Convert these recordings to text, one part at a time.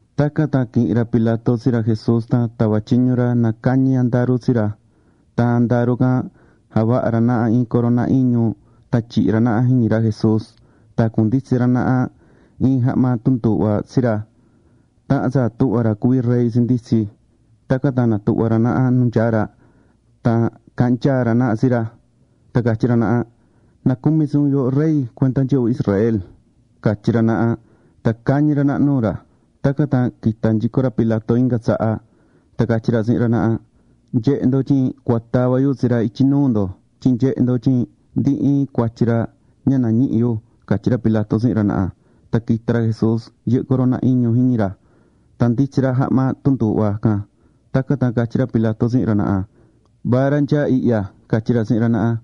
Tacan tan quihi̱n ra Pilato tsi ra Jesús tan tava̱ tyiñu ra na cañi andaru tsi ra. Tan andaru can javaha̱ ra naha iin corona iñu tan tyihi̱ ra naha jiñi ra Jesús. Tan jacunditsi̱ ra naha iin jahma tunduuhva tsi ra, tahan tsa tuhvá ra cuví rey tsinditsí. Tacan tan natuhva̱ ra naha nu nyáá ra tan caahán nyaa ra naha tsi ra, tan catyí ra naha: ―¡Nacumi tsi un yooho Rey cuenda nyɨvɨ Israel! ―catyí ra naha, tan cañí ra naha nuu ra. Tacan tan quita̱ nyico ra Pilato inga tsaha tan catyí ra tsihin ra naha: ―Nye̱he ndo tyin cua tava yu tsi ra ityi nuu ndo tyin nyehe ndo tyin ndi iin cuatyi ra ña nañihí yu ―catyí ra Pilato tsihin ra naha. Tan quita̱ ra Jesús yɨhɨ́ corona iñu jiñi ra, tan nditsí ra jahma tunduuhva can. Tacan tan catyí ra Pilato tsihin ra naha: ―¡Ma ra nyaá ihya! ―catyí ra tsihin ra naha.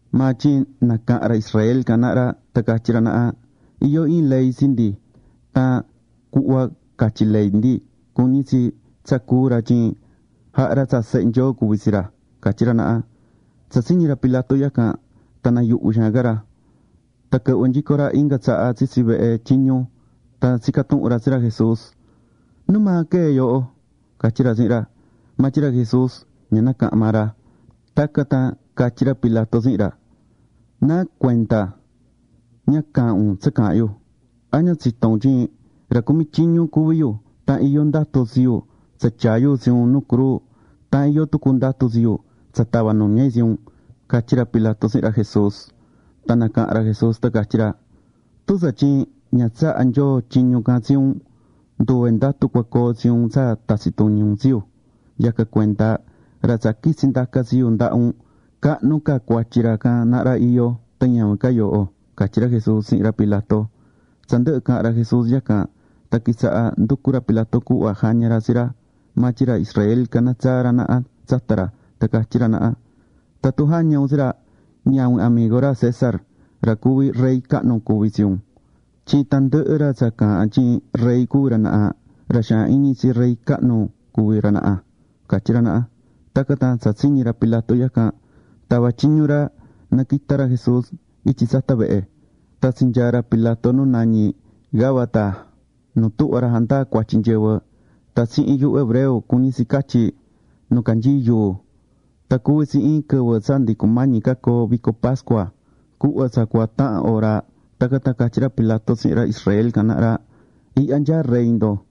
Maa tyin nacaha̱n ra Israel can naha ra tan catyí ra naha: ―Iyó iin ley tsi ndi, tan cuhva catyí ley ndi, cuñí tsi tsa cúu ra tyin jahá ra tsa Sehe Nyoo cuví tsi ra ―catyí ra naha. Tsa tsiñi̱ ra Pilato yacan, tan nayuhvi̱ xaan ca ra. Tan quɨhvɨ̱ nyico ra inga tsaha tsitsi vehe tyiñu, tan tsica̱ tuhun ra tsi ra Jesús: ―¿Nu maa quee̱ yooho? ―catyí ra tsihin ra. Maa tyin ra Jesús ña nacaha̱n maa ra. Tacan tan catyí ra Pilato tsihin ra: ―¿Nacuenda ña caahán un tsa caahán yu? ¿A ña tsitó un tyin ra cumí tyiñu cuví yu tan iyó ndatu tsi yu tsa tyaa yu tsi un nu cruu, tan iyó tucu ndatu tsi yu tsa tava nuña yu tsi un? ―catyí ra Pilato tsihin ra Jesús. Tan nacaha̱n ra Jesús tan catyí ra: ―Tun tsatyin ña tsaha̱ Nyoo tyiñu can tsi un, nduve ndatu cua coo tsi un tsa tatsi tuñi un tsi yu. Yacan cuenda, ra tsa quitsi ndaca tsi yu ndaha un, cahnu ca cuatyi ra can naha ra iyó tan ñavin ca yooho ―catyí ra Jesús tsihin ra Pilato. Tsa ndɨhɨ caha̱n ra Jesús yacan, tan quitsaha̱ nducú ra Pilato cuhva jaña ra tsi ra, maa tyin ra Israel caná tsaa ra naha tsata ra, tan catyí ra naha: ―¡Tatun jaña un tsi ra, ñavin amigo ra César, ra cuví rey cahnu, cuví tsi un! Tyin tandɨhɨ ra tsa caahán tyin rey cuví ra naha, ra xaan iñi tsi rey cahnu cuví ra naha ―catyí ra naha. Tacan tan tsa tsiñi̱ ra Pilato yacan, tava̱ tyiñu ra na quita ra Jesús ityi tsata vehe. Tan tsinyaa̱ ra Pilato nu nañí Gabata nu tuhvá ra jandaá cuatyi nyɨvɨ. Tan tsihin yuhu hebreo cuñí tsi catyí: “Nu canyií yuu”. Tan cuví tsi iin quɨvɨ tsa ndi cumañi ca coo vico pascua, cuhva tsa cua tahan hora. Tacan tan catyí ra Pilato tsihin ra Israel can naha ra: ―¡Ihya nyaá rey ndo!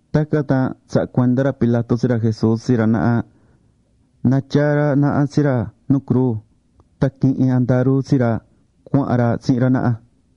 Tacan tan tsaha̱ cuenda ra Pilato tsi ra Jesús tsi ra naha na tyaa ra naha tsi ra nu cruu. Tan quihi̱n andaru tsi ra, cuahán ra tsihin ra naha.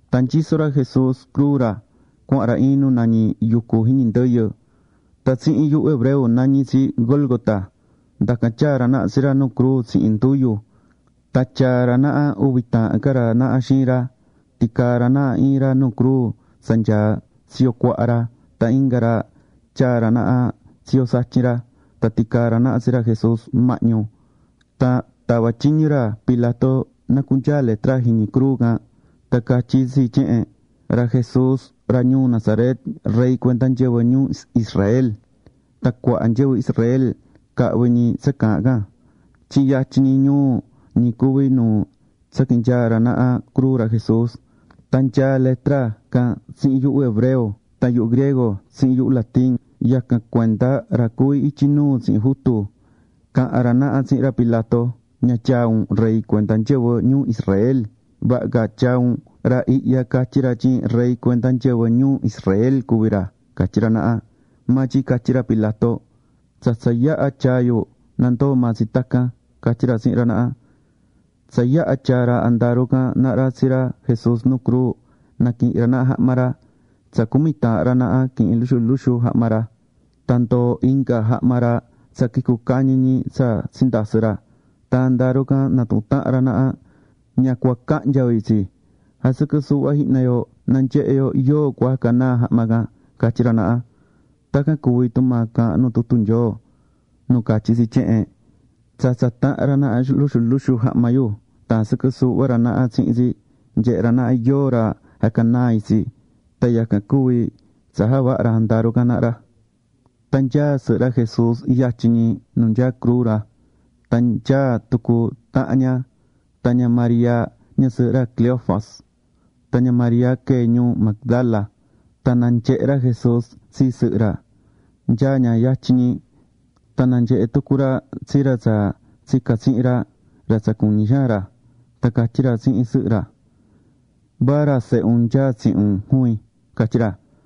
Tan nyisó ra Jesús cruu ra, cuahán ra iin nu nañí: “Yɨquɨ Jiñi Ndɨyɨ”. Tan tsihin yuhu hebreo nañí tsi Gólgota. Ndacan tyaa̱ ra naha tsi ra nu cruu tsihin nduyu. Tan tyaa̱ ra naha uvi taahan ca ra naha xiin ra. Ticaa̱ ra naha iin ra nu cruu tsa nyaá tsiyo cuaha ra. Tan inga ra tyaa̱ ra naha tsiyo satyin ra. Tan ticaa̱ ra naha tsi ra Jesús mahñu. Tan tava̱ tyiñu ra Pilato na cunyaa letra jiñi cruu can. Tan catyí tsi tyehen: “Ra Jesús ra ñuu Nazaret, Rey cuenda nyɨvɨ ñuu Israel.” Tan cuaha nyɨvɨ Israel cahvi̱ ñi tsa caahán can, tyin yatyin ñi ñuu ñi cuví nu tsaquinyaa̱ ra naha cruu ra Jesús. Tan nyaá letra can tsihin yuhu hebreo, tan yuhu griego, tsihin yuhu latín. Yacan cuenda ra cuví ityi nuu tsihin jutu caha̱n ra naha tsihin ra Pilato: ―Ña tyaa un: “Rey cuenda nyɨvɨ ñuu Israel”, vaha ca tyaa un: “Ra ihya catyí ra tyin rey cuenda nyɨvɨ ñuu Israel cuví ra” ―catyí ra naha. Maa tyin catyí ra Pilato: ―Tsa tsa yaha̱ tyaa̱ yu, nandoo maa tsi tacan ―catyí ra tsihin ra naha. Tsa yaha̱ tyaa̱ ra andaru can naha ra tsi ra Jesús nu cruu, naquihi̱n ra naha jahma ra. Tsa cumi taahan ra naha quihi̱n luxu luxu jahma ra. Tan ndoo̱ jahma ra tsa quicu̱ cañi ñi tsa tsindasɨ̱ ra. Tan andaru can natuhún tahan ra naha: ―Ña cua cahnya yo itsi. Jasɨquɨ suuhva jihna yo na nyehe yo yóo cua jaha canaa jahma can ―catyí ra naha. Tacan cuvi̱ tumaa caahán nu tutu Nyoo nu catyí tsi tyehen: “Tsatsa̱ tahan ra naha luxu luxu jahma yu tan jasɨquɨ̱ suuhva ra naha tsihin tsi, nyehe̱ ra naha yóo ra jaha canaa itsi.” Tan yacan cuvi tsa javaha̱ ra andaru can naha ra. Tan nyáá sɨhɨ ra Jesús yatyin ñi nu nyaá cruu ra. Tan nyáá tucu tahan ña, tan ña María ñasɨɨhɨ ra Cleofas, tan ña María quee̱ ñuu Magdala. Tan nanyehe̱ ra Jesús tsi sɨhɨ ra, nyáá ña yatyin ñi. Tan nanyehe̱ tucu ra tsi ra tsa tsica̱ tsihin ra, ra tsa cuñí xaan ra. Tan catyí ra tsihin sɨhɨ ra: ―Miya, va ra sehe un nyáá tsihin un juvin ―catyí ra.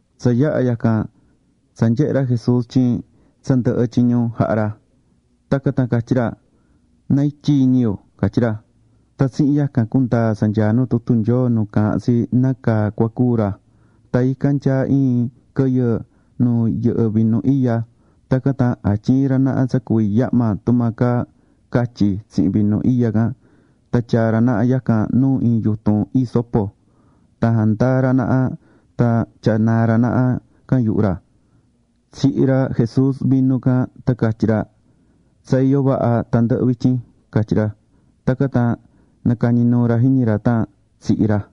Tsa yaha̱ yacan, tsa nyehe̱ ra Jesús tyin tsa ndɨhɨ̱ tyiñu jaha̱ ra. Tacan tan catyí ra: ―Na ityi iñi yu ―catyí ra. Tan tsihin yacan cundaa̱ tsa nyaá nu tutu Nyoo nu caahán tsi nácaa cua cúu ra. Tan ican nyaá iin quɨyɨ nu yɨhɨ́ vinu iya. Tacan tan jatyii̱ ra naha tsa cuví yahma tumaa caa catyi tsihin vinu iya can. Tan tyaa̱ ra naha yacan nu iin yutun hisopo. Tan jandaa̱ ra naha tan tyanaa̱ ra naha can yuhu ra. Tsihi̱ ra Jesús vinu can tan catyí ra: ―Tsa iyó vaha tandɨhɨ vityin ―catyí ra. Tacan tan nacañi̱ nuu ra jiñi ra tan tsihi̱ ra.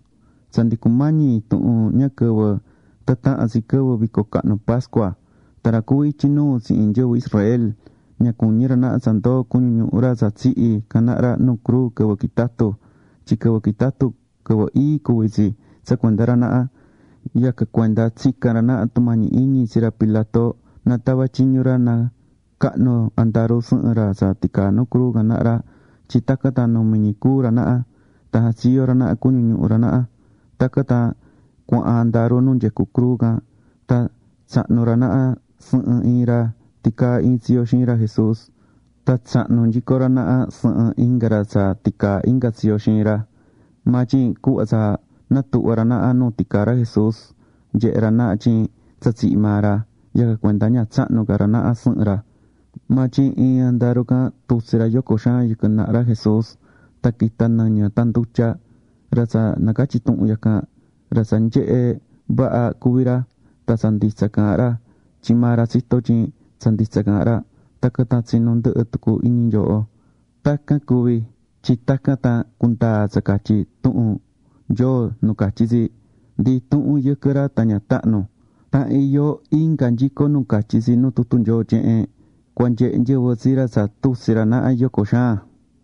Tsa ndi cumañi intuhun ña quɨvɨ tan tahan tsi quɨvɨ vico cahnu pascua, tan ra cuví ityi nuu tsihin nyɨvɨ Israel ña cuñí ra naha tsa ndoo cuñu ñuhu ra tsa tsihi̱ can naha ra nu cruu quɨvɨ quitatú, tyin quɨvɨ quitatú, quɨvɨ ii cuví tsi tsa cuenda ra naha. Yacan cuenda tsica̱n ra naha tumañi iñi tsi ra Pilato na tava tyiñu ra na cahnu andaru sɨhɨn ra tsa ticaa nu cruu can naha ra, tyin tacan tan numi ñi cúu ra naha, tan jatsiyo ra naha cuñu ñuhu ra naha. Tacan tan cuahán andaru nu nyecú cruu can. Tan tsahnu̱ ra naha sɨhɨn iin ra ticaá iin tsiyo xiin ra Jesús. Tan tsahnu̱ nyico ra naha sɨhɨn inga ra tsa ticaa inga tsiyo xiin ra. Maa tyin cuhva tsa natuhva̱ ra naha nu ticaá ra Jesús, nyehe̱ ra naha tyin tsa tsihi̱ maa ra. Yacan cuenda ña tsahnu̱ ca ra naha sɨhɨn ra. Maa tyin iin andaru can tutsi̱ ra yoco xaan yɨquɨ naha ra Jesús. Tan quita̱ nɨñɨ tan ndutya. Ra tsa nacatyí tuhun yacan, ra tsa nyehe̱ vaha cuví ra. Tan tsa nditsa caahán ra, tyin maa ra tsitó tyin tsa nditsa caahán ra, tacan tan tsinu ndɨhɨ tucu iñi nyooho. Tacan cuvi̱ tyin tacan tan cundaa tsa catyí tuhun Nyoo nu catyí tsi: “Ndi intuhun yɨquɨ ra tan ña tahnu.” Tan iyó inga nyico nu catyí tsi nu tutu Nyoo tyehen: “Cua nyehe nyɨvɨ tsi ra tsa tutsi̱ ra naha yoco xaan.”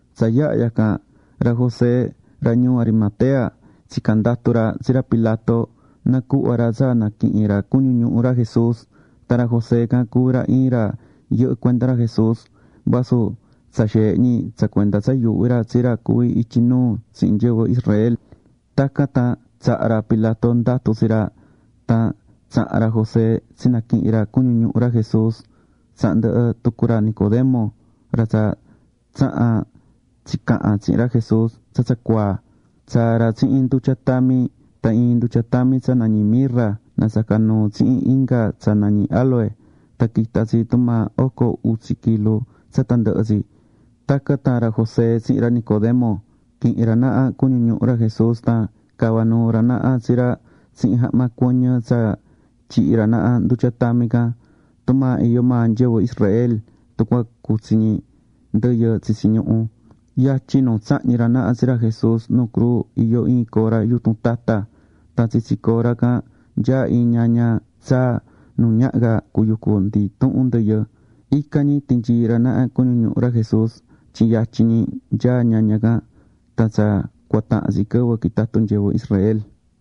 Tsa yaha̱ yacan, ra José ra ñuu Arimatea tsica̱n ndatu ra tsi ra Pilato na cuhva ra tsa naquihin ra cuñu ñuhu ra Jesús. Tan ra José can cuví ra iin ra yɨhɨ́ cuenda ra Jesús vasu tsa xeehe ñi tsa cuenda tsa yuuhví ra tsi ra cuví ityi nuu tsihin nyɨvɨ Israel. Tacan tan tsaha̱ ra Pilato ndatu tsi ra, tan tsaha̱n ra José tsinaquihi̱n ra cuñu ñuhu ra Jesús. Tsaha̱n ndɨhɨ tucu ra Nicodemo, ra tsa tsaha̱n tsicaha̱n tsihin ra Jesús tsa tsa cuaa. Tsaa̱ ra tsihin ndutya tami. Tan iin ndutya tami tsa nañí mirra nasaca̱ nuu tsihin inga tsa nañí áloe. Tan quita̱ tsi tumaa oco utsi kilu tsa tandɨhɨ tsi. Tacan tan ra José tsihin ra Nicodemo quihi̱n ra naha cuñu ñuhu ra Jesús tan cava̱ nuu ra naha tsi ra tsihin jahma cuɨñɨ tsa tyihi̱ ra naha ndutya tami can, tumaa iyó maa nyɨvɨ Israel tun cua cutsi ñi ndɨyɨ tsitsi ñuhu. Yatyin nu tsahñi̱ ra naha tsi ra Jesús nu cruu iyó iin cora yutun tata. Tan tsitsi cora can nyaá iin ñaña tsaa nu ñaha ca cuyucu ndi intuhun ndɨyɨ. Ican ñi tinyii̱ ra naha cuñu ñuhu ra Jesús tyin yatyin ñi nyaá ñaña can tan tsa cua tahan tsi quɨvɨ quitatú nyɨvɨ Israel.